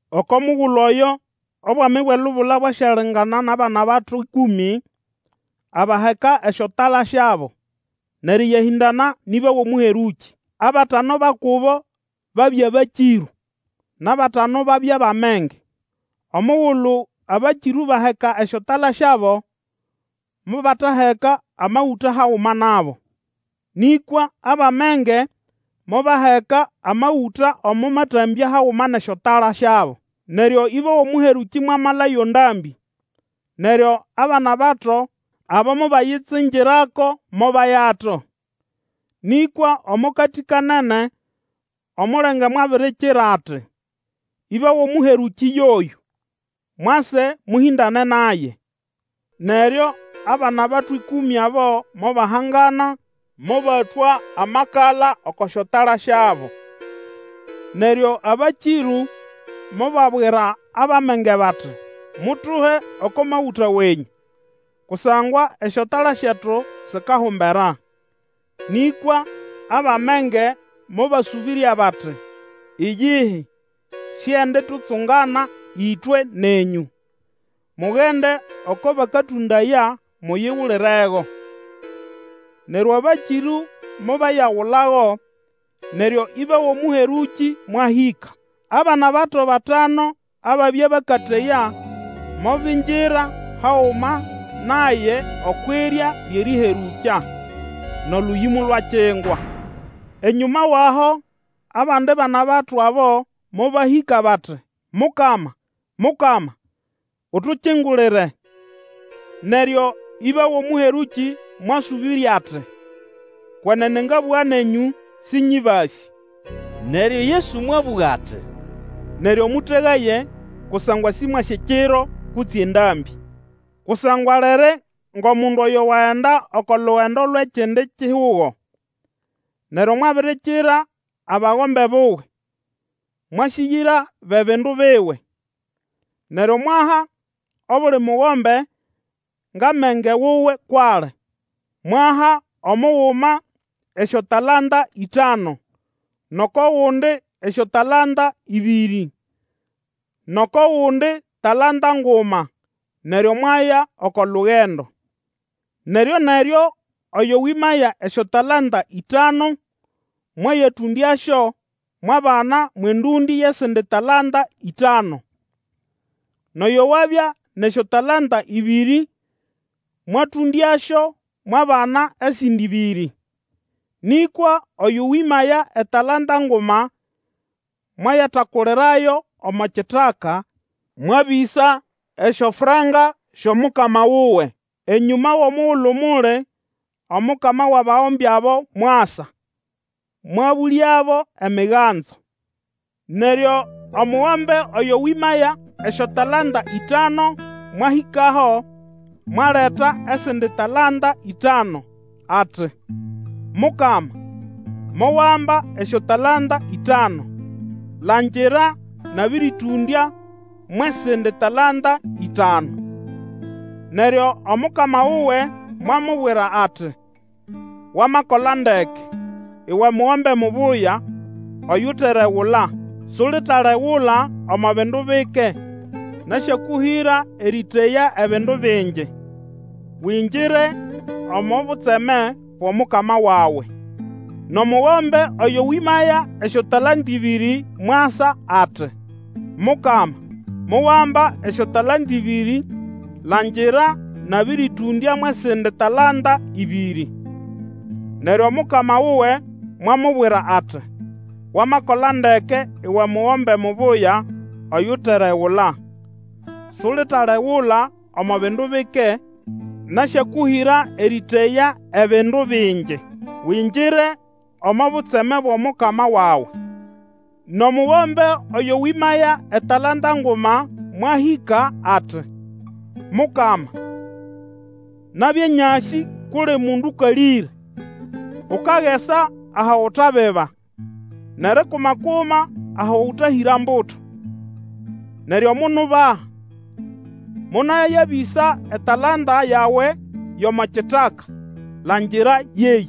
Oko mugulu oyo Obwami bwʼelubula bwasyalingana nʼabana-bato ĩkũmĩ, abaheka esyotala syabo, nʼerĩyahĩndana nʼĩba wʼomũherũkĩ. Abatanu ba kubo babya bakĩrũ, nʼabatanu babya bʼamenge. Omugulu abakĩrũ baheka esyotala syabo, mobataheka amagũta haguma nabo. Nĩkwa abʼamenge mobaheka amagũta omo matambya haguma nʼesyotala syabo. Neryo ĩba wʼomũherũkĩ mwamala yo ndambĩ, neryo abana-bato abo mobayitsingirako, mobayato. Nĩkwa omo katĩ-kanene omulenge mwabirikira ati, Ĩba wʼomũherũkĩ yoyũ! Mwase, mũhĩndane naye! Neryo abanabato ĩkũmĩ abo mobahangana, mobatwa amakala oko syotala syabo. Neryo abakĩrũ mobabwira abʼamenge bati, Mutuhe oko magũta wenyũ, kusangwa esyotala syetu sikahumbera. Nĩkwa abʼamenge mobasũbĩrya bati, Iyihi, sienditutsungana ĩtwe, nenyũ. Mugende oko bakatũndaya muyigulirego. Neryo abakĩrũ mobayagulago, neryo ĩba wʼomũherũkĩ mwahĩka. Abana-bato batanu ababya bakateya mobingira haguma naye okwʼirya lyʼerĩherũkya. Nʼolũyĩ molwakingwa. Enyũma wʼaho abandi bana-bato abo mobahĩka bati, Mukama, Mukama, utukingulire. Neryo ĩba wʼomũherũkĩ mwasũbĩrya ati, Kwenene ngabũga nenyũ, Sĩnyĩbasĩ. Neryo Yesu mwabũga ati, Neryo mũtegaye, kusangwa sĩmwasĩ ekiro kutse endambĩ. Kusangwa liri ngʼomundu oyo wagenda oko lugendo lwʼekindi kihugo, neryo mwabirikira abagombe buwe, mwasĩgĩra bʼebindu biwe. Neryo mwaha obuli mugombe ngʼamenge wuwe kwʼali. Mwaha omuguma esyotalanta ĩtanu nʼoko gundi esyotalanta ĩbĩrĩ, nʼoko gundi talanta nguma, neryo mwaya oko lugendo. Neryo-neryo oyo wĩmaya esyotalanta ĩtanu, mwayatũndyasyo, mwabana mwʼendũndĩ yʼesindi talanta ĩtanu. Nʼoyo wabya nʼesyotalanta ĩbĩrĩ mwatũndyasyo, mwabana esindi ĩbĩrĩ. Nĩkwa oyo wĩmaya etalanta nguma mwayatakulirayo omo kitaka, mwabĩsa esyofranka syʼOmukama wuwe. Enyũma wʼomugulu muli, omukama wʼabagombe abo mwasa, mwabũlyabo emiganzo. Neryo omugombe oyo wĩmaya esyotalanta ĩtanu mwahĩkaho, mwaleta esindi talanta ĩtanu, ati, Mukama, mowamba esyotalanta ĩtanu. Langira! Nabĩrĩtũndya mwʼesindi talanta ĩtanu. Neryo omukama wuwe mwamubwira ati, Wamakola ndeke, uwe mugombe mubuya oyuteregula! Sulitalegula omo bindu bike, nasyakũhĩra erĩteya ebindu bingi. Wingire omo butseme bwʼomukama wawe! Nʼomugombe oyo wĩmaya esyotalanta ĩbĩrĩ mwasa ati, Mukama, mowamba esyotalanta ĩbĩrĩ langira, nabĩrĩtũndya mwʼesindi talanta ĩbĩrĩ. Neryo omukama wuwe mwamubwira ati, Wamakola ndeke uwe mugombe mubuya oyuteregula! Sulitalegula omo bindu bike, nasyakũhĩra erĩteya bindu bingi. Wingire omo butseme bwʼomukama wawe! Nʼomugombe oyo wĩmaya etalanta nguma mwahĩka ati, Mukama, nabya nyasĩ kʼuli mundu Ũkalĩre, ukagesa aho utabiba, nʼerikuma-kuma aho ũtahĩra mbuto. Neryo monubaha, monayabĩsa etalanta yawe yʼomo kitaka. Langira! Yeyĩ!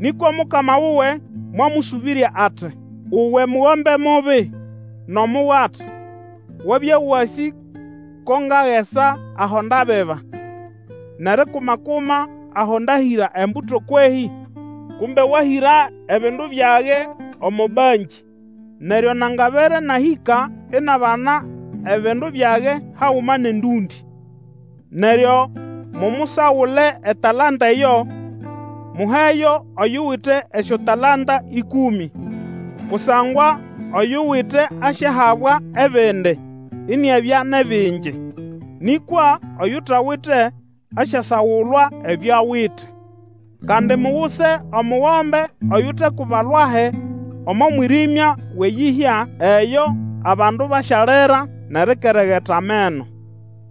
Nĩkwa omukama wuwe mwamũsũbĩrya ati, Uwe mugombe mubi nʼomugata, wabya wasĩ ko ngagesa aho ndabiba, nʼerikuma-kuma aho ndahĩra embuto kwehĩ? Kumbe wahĩra ebindu byage omo bankĩ, neryo nangabere nahĩka inabana ebindu byage haguma nʼendũndĩ. Neryo mumusagule etalanta eyo, muheyo oyuwite esyotalanta ĩkũmĩ. Kusangwa oyuwite asyahabwa ebindi, iniabya nʼebingi; nĩkwa oyutawite, asyasagulwa ebyo awite. Kandi muguse omugombe oyutekuba lwahi omo mwĩrĩmya wʼeyĩhya; eyo abandu basyalira nʼerikeregeta ameno.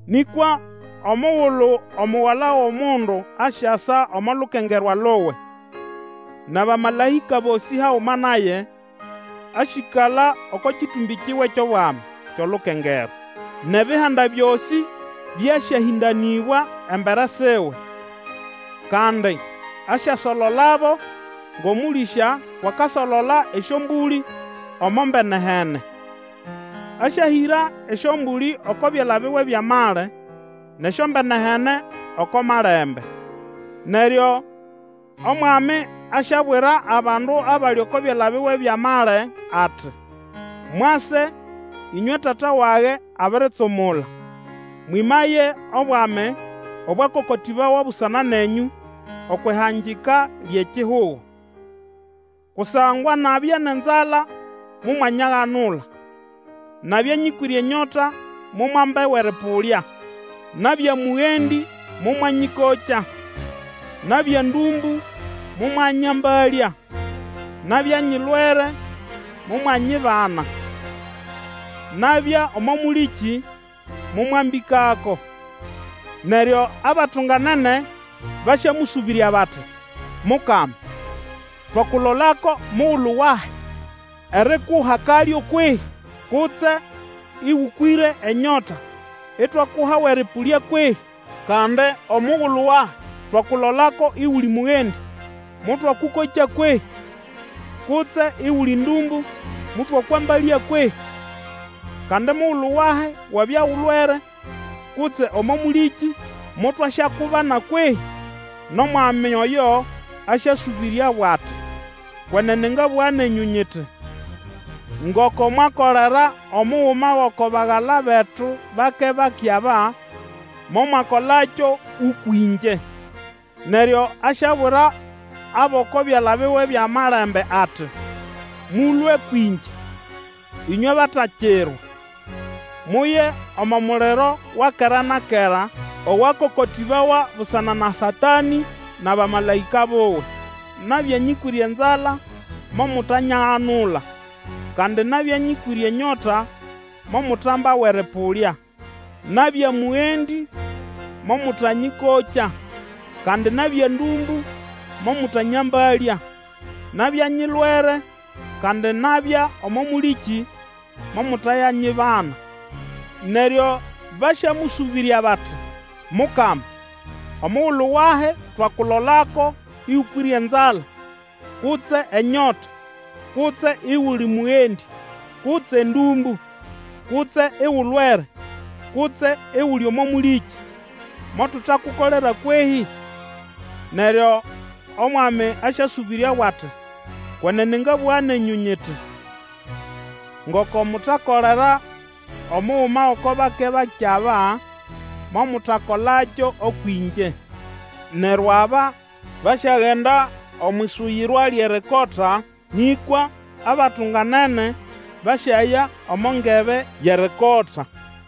Nĩkwa omugulu Omugala wʼomundu asyasa omo lukengerwa luwe, nʼabamalaĩka bosĩ haguma naye, asyĩkala oko kĩtũmbĩ kiwe kyʼobwami kyʼolukengerwa. Nʼebihanda byosĩ byasyahĩndanĩbwa embere siwe; kandi asyasololabo ngʼomũlĩsya kwʼakasolola esyombũlĩ omo mbene-hene. Asyahĩra esyombũlĩ oko byala biwe byʼamali, nʼesyombene-hene oko malembe. Neryo Omwami asyabwira abandu abali oko byala biwe byʼamali ati, Mwase, ĩnywe Tata wage abiritsumula, mwĩmaye obwami obwakokotĩbawa busana nenyũ okwʼihangika lyʼekihugo. Kusangwa nabya nʼenzala momwanyaganula; nabya nyĩkwĩre enyota momwamba awʼerĩpũlya; nabya mũgendĩ, momwanyĩkokya. Nabya ndũmbũ momwanyambalya; nabya nyilwere, momwanyibana; nabya omo mũlĩkĩ, momwambĩkako. Neryo abatunganene basyamũsũbĩrya bati, Mukama, twakulolako mugulu wahi, erikuha kalyo kwehĩ? Kutse ĩgũkwĩre enyota itwakuha awʼerĩpũlya kwehĩ? Kandi omugulu wahi twakulolako iguli mũgendĩ, motwakũkokya kwehĩ? Kutse iguli ndũmbũ motwakwambalya kwehĩ? Kandi mugulu wahi wabya ulwere, kutse omo mũlĩkĩ motwasyakubana kwehĩ? Nʼomwami oyo asyasũbĩryabo ati, Kwenene ngabũga nenyũ nyiti, Ngoko mwakolera omuguma gʼoko bagala betu bake-bake aba, momwakolakyo ũkwʼĩngye. Neryo asyabwira abʼoko byala biwe byʼamelembe ati, Mũlũe kwĩngye, ĩnywe batakirwa! Muye omo muliro wa kera na kera owakokotĩbawa busana na Satanĩ nʼabamalaĩka buwe. Nabya nyĩkwĩre enzala, momutanyaganula, kandi nabya nyĩkwĩre enyota, momutamba awʼerĩpũlya. Nabya mũgendĩ, momũtanyĩkokya, kandi nabya ndũmbũ, momũtanyambalya, nabya nyilwere, kandi nabya omo mũlĩkĩ, momutayanyibana. Neryo basyamũsũbĩrya bati, Mukama, omugulu wahi twakulolako ĩgũkwĩre enzala, kutse enyota, kutse iguli mũgendĩ, kutse ndũmbũ, kutse igulwere, kutse iguli omo mũlĩkĩ, motutakukolera, kwehĩ? Neryo Omwami asyasũbĩryabo ati, Kwenene ngabũga nenyũ nyiti, Ngoko mutakolera omuguma gʼoko bake-bake aba, momutakolakyo ũkwʼĩngye. Neryo aba basyagenda omwʼisuyirwa lyʼerikota, nĩkwa abatunganene basyaya omo ngebe yʼerikota.